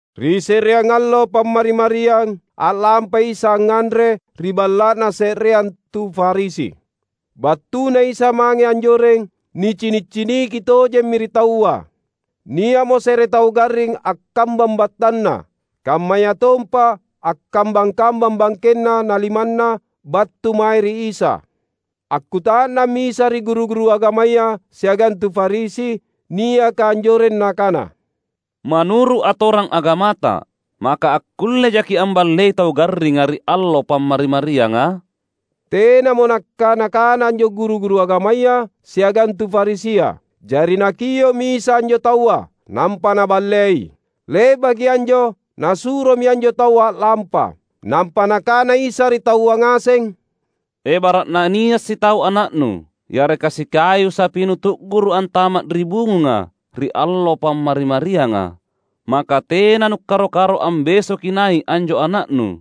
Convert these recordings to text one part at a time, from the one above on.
Ri se’reang allo Pammari-mariang, a’lampai Isa angnganre ri balla’na se’reang tu Farisi. BattuNa Isa mange anjoreng, nicini’-ciniki tojemmi ri taua. Nia’mo se’re tau garring akkambang battanna, kammayatompa akkambang-kambang bangkenna na limanna battu mae ri Isa. Akkuta’nammi Isa ri guru-guru agamaya siagang tu Farisi niaka anjoreng Nakana, "Manuru’ atorang agamata, maka akkullejaki’ amballei tau garringa ri allo Pammari-marianga?" Tenamo nakkana-kana anjo guru-guru agamaya siagang tu Farisia. Jari Nakio’mi Isa anjo taua, nampa Naballei. Le’baki anjo, Nasuromi anjo taua a’lampa. Nampa Nakana Isa ri taua ngaseng, "Ebara’na nia’ sitau ana’nu yareka sikayu sapinu tu’guru’ antama’ ri bungunga ri allo Pammari-marianga, maka tena nukkaro-karo ambesoki nai’ anjo ana’nu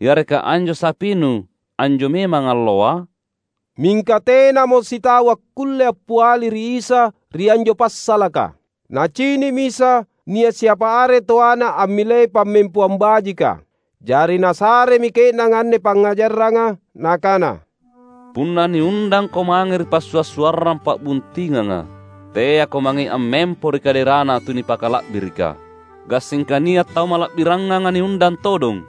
yareka anjo sapinu, anjo memang alloa?" Mingka tenamo sitau akkulle appiali ri Isa ri anjo passalaka. Nacini’mi Isa nia’ siapa are toana ammilei pammempoang bajika. Jari Nasaremi ke’nanga anne pangngajaranga, Nakana, "Punna niundangko mange ri passua’-suarrang pa’buntinganga, teako mangei ammempo ri kaderana tunipakala’birika. Gassingka nia’ tau mala’birangnganga niundang todong.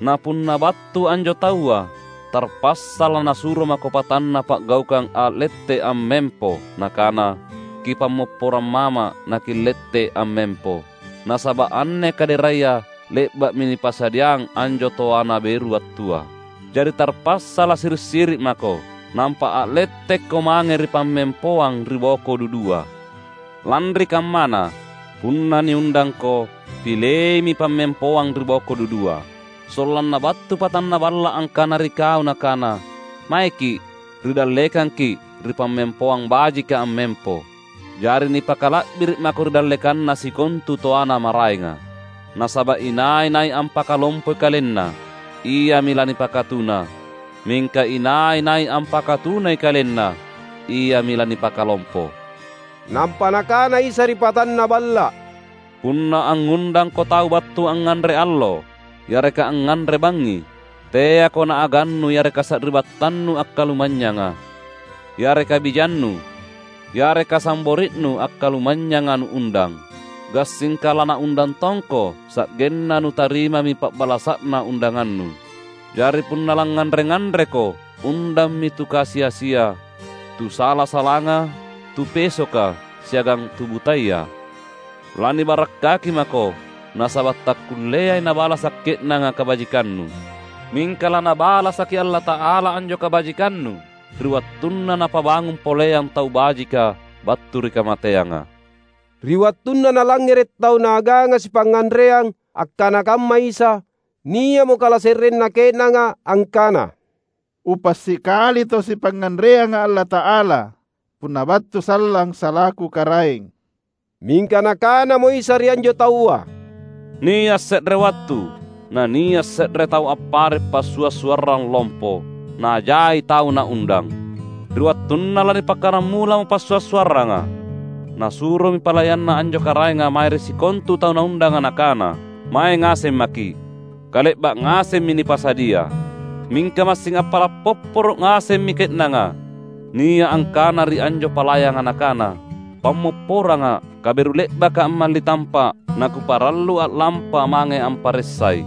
Na punna battu anjo taua tarpassa lanasuro mako patanna pa’gaukang a’lette’ ammempo nakana, ‘Kipammopporang mama’ naki’lette’ ammempo, nasaba’ anne kaderaya le’ba’mi nipasadiang anjo toana beru battua.’ Jari tarpassa lasiri’-siri’ mako, nampa a’lettekko mange ri pammempoang ri boko dudua. Lanri kammana, punna niundangko, pileimi pammempoang riboko dudua. Sollanna battu patanna balla’ angkana ri kau nakana, ‘Maeki’, ri dallekangki’ ri pammempoang bajika ammempo.’ Jari nipakala’biri’ mako ri dallekanna sikontu toana maraenga. Nasaba’ inai-nai ampakalompoi kalenna, iami lanipakatuna, mingka inai-nai ampakatunai kalenna, iami lanipakalompo." Nampa Nakana Isa ri patanna balla’, "Punna angngundangko tau battu angnganre allo yareka angnganre bangngi, teako naagannu yareka sari’battannu akkalumanynyanga, yareka bijannu, yareka sambori’nu akkalumanynyanga nuundang. Gassingka lanaundang tongko, sa’genna nutarimami pa’balasa’na undangannu. Jari punna langnganre-nganreko, undammi tu kasi-asia, tu sala-salanga, tu pesoka, siagang tu butaya. Lanibarakkaki mako, nasaba’ takkulleai nabalasa’ ke’nanga kabajikannu. Mingka laNabalasaki Allata’ala anjo kabajikannu ri wattunna napabangung poleang tau bajika battu ri kamateanga." Ri wattunna nalangngere’ tau naaganga sipangnganreang akkana kamma Isa, nia’mo kalase’renna ke’nanga angkana, "Upa’ sikali tau sipangnganreanga Allata’ala punna battu sallang salaku Karaeng!" Mingka Nakanamo Isa ri anjo taua, "Nia’ se’re wattu, nania’ se’re tau appare’ passua’-suarrang lompo, na jai tau naundang. Ri wattunna lanipakkaramulamo passua’-suarranga, nasuromi palayanna anjo karaenga mange ri sikontu tau naundanga nakana, ‘Mae ngaseng maki’, kale’ba’ ngasemmi nipasadia!’ Mingka massing appala’ popporo’ ngasemmi ke’nanga: Nia’ angkana ri anjo palayanga nakana, ‘Pammopporanga’, kaberu le’baka’ ammali tampa’ nakuparallu a’lampa mange amparessai.’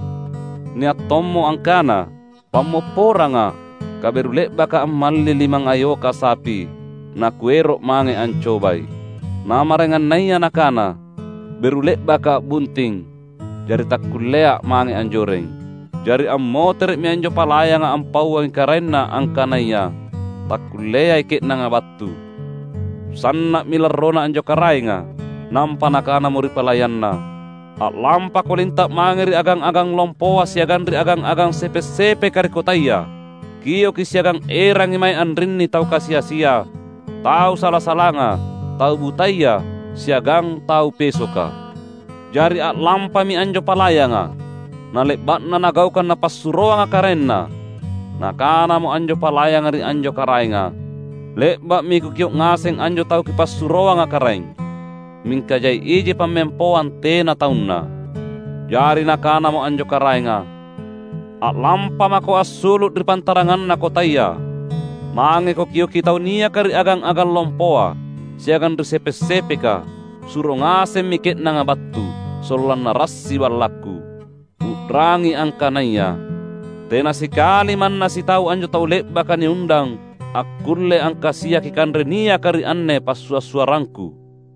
Nia’ tommo angkana, ‘Pammopporanga’, kaberu le’baka ammalli limangngayoka sapi, nakuero’ mange ancobai.’ Na maraengannaya nakana, ‘Beru le’baka’ a’bunting, jari takkullea’ mange anjoreng.’ Jari ammotere’mi anjo palayanga ampauangi karaenna angkanaya takkulleai ke’nanga battu. Sanna’mi larrona anjo karaenga. Nampa nakanamo ri palayanna, ‘A’lampako linta’ mange ri agang-agang lompoa siagang ri agang-agang sepe’-sepeka ri kotaya. Kioki siagang erangi mae anrinni tau kasi-asia, tau sala-salanga, tau butaya, siagang tau pesoka.’ Jari a’lampami anjo palayanga. Nale’ba’na nagaukang napassuroanga karaenna, nakanamo anjo palayanga ri anjo karaenga, ‘Le’ba’mi kukio’ ngaseng anjo tau kipassuroanga karaeng, mingka jai iji pammempoang tena taunna.’ Jari nakanamo anjo karaenga, ‘A’lampamako assulu’ ri pantaranganna kotaya, mangeko kioki tau niaka ri agang-agang lompoa, siagang ri sepe’-sepeka; suro ngasemmi ke’nanga battu, sollanna rassi ballakku. U’rangi angkanaya, tena sikali manna sitau anjo tau le’baka niundang akkulle angkasiaki kanre niaka ri anne passua’-suarrangku!’"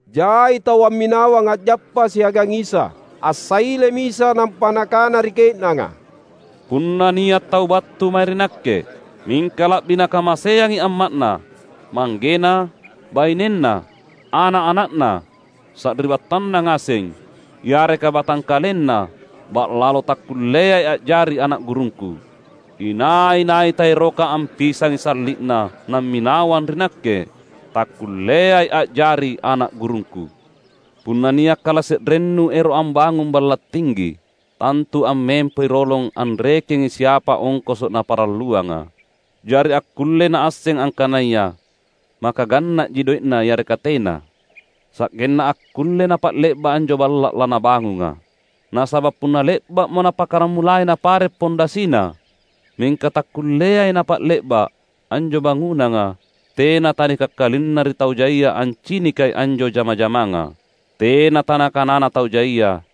Jai tau amminawang a’jappa siagang Isa. Assailemi Isa nampa Nakana ri ke’nanga, "Punna nia’ tau battu mae ri Nakke, mingka la’bi nakamaseangi amma’na, manggena, bainenna, ana’-ana’na, sari’battanna ngaseng, yareka batangkalenna ba’lalo, takkulleai a’jari ana’ gurungKu. Inai-nai taeroka ampisangi salli’na namminawang ri Nakke, takkulleai a’jari ana’ gurungKu. Punna nia’ kalase’rennu ero’ ambangung balla’ tinggi, tantu ammempoi rolong anrekengi siapa ongkoso’ naparalluanga. Jari akkullei naasseng angkanaya maka ganna’ji doe’na yareka tena, sa’genna akkulle napa’le’ba’ anjo balla’ lanabangunga. Nasaba’ punna le’ba’mo napakkaramulai napare’ pundasina, mingka takkulleai napa’le’ba’, anjo bangunanga, tena tanikakkalinna ri tau jaia ancinikai anjo jama-jamanga. Tena tanakanana tau jaia,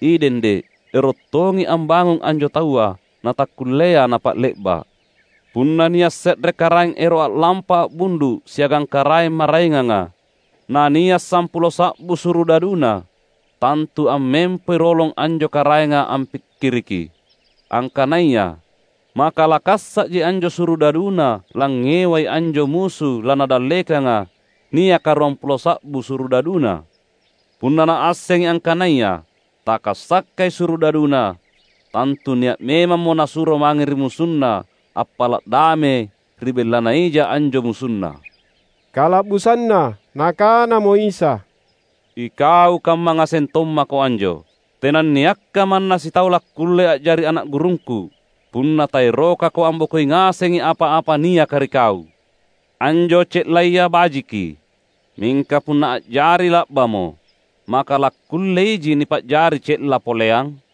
‘Idende’, erottongi ambangung anjo taua, natakkullea napa’le’ba’!’ Punna nia’ se’re karaeng ero’ a’lampa a’bundu’ siagang karaeng maraenganga, na nia’ sampulo sa’bu surudaduna, tantu ammempoi rolong anjo karaenga ampikkiriki, angkanaya maka lakassa’ji anjo surudaduna langngewai anjo musu lanadallekanga niaka ruampulo sa’bu surudaduna. Punna naassengi angkanaya takassakai surudaduna, tantu nia’ memammo nasuro mange ri musunna appala’ dame ri bellana ija anjo musunna." Kala’busanna Nakanamo Isa, "Ikau kamma ngaseng tommako anjo. Tenanniakka manna sitau lakkulle a’jari ana’ gurungKu, punna taerokako ambokoi ngasengi apa-apa niaka ri kau." "Anjo ce’laya bajiki; mingka punna a’jari la’bamo, maka lakkulleiji nipa’jari ce’la poleang?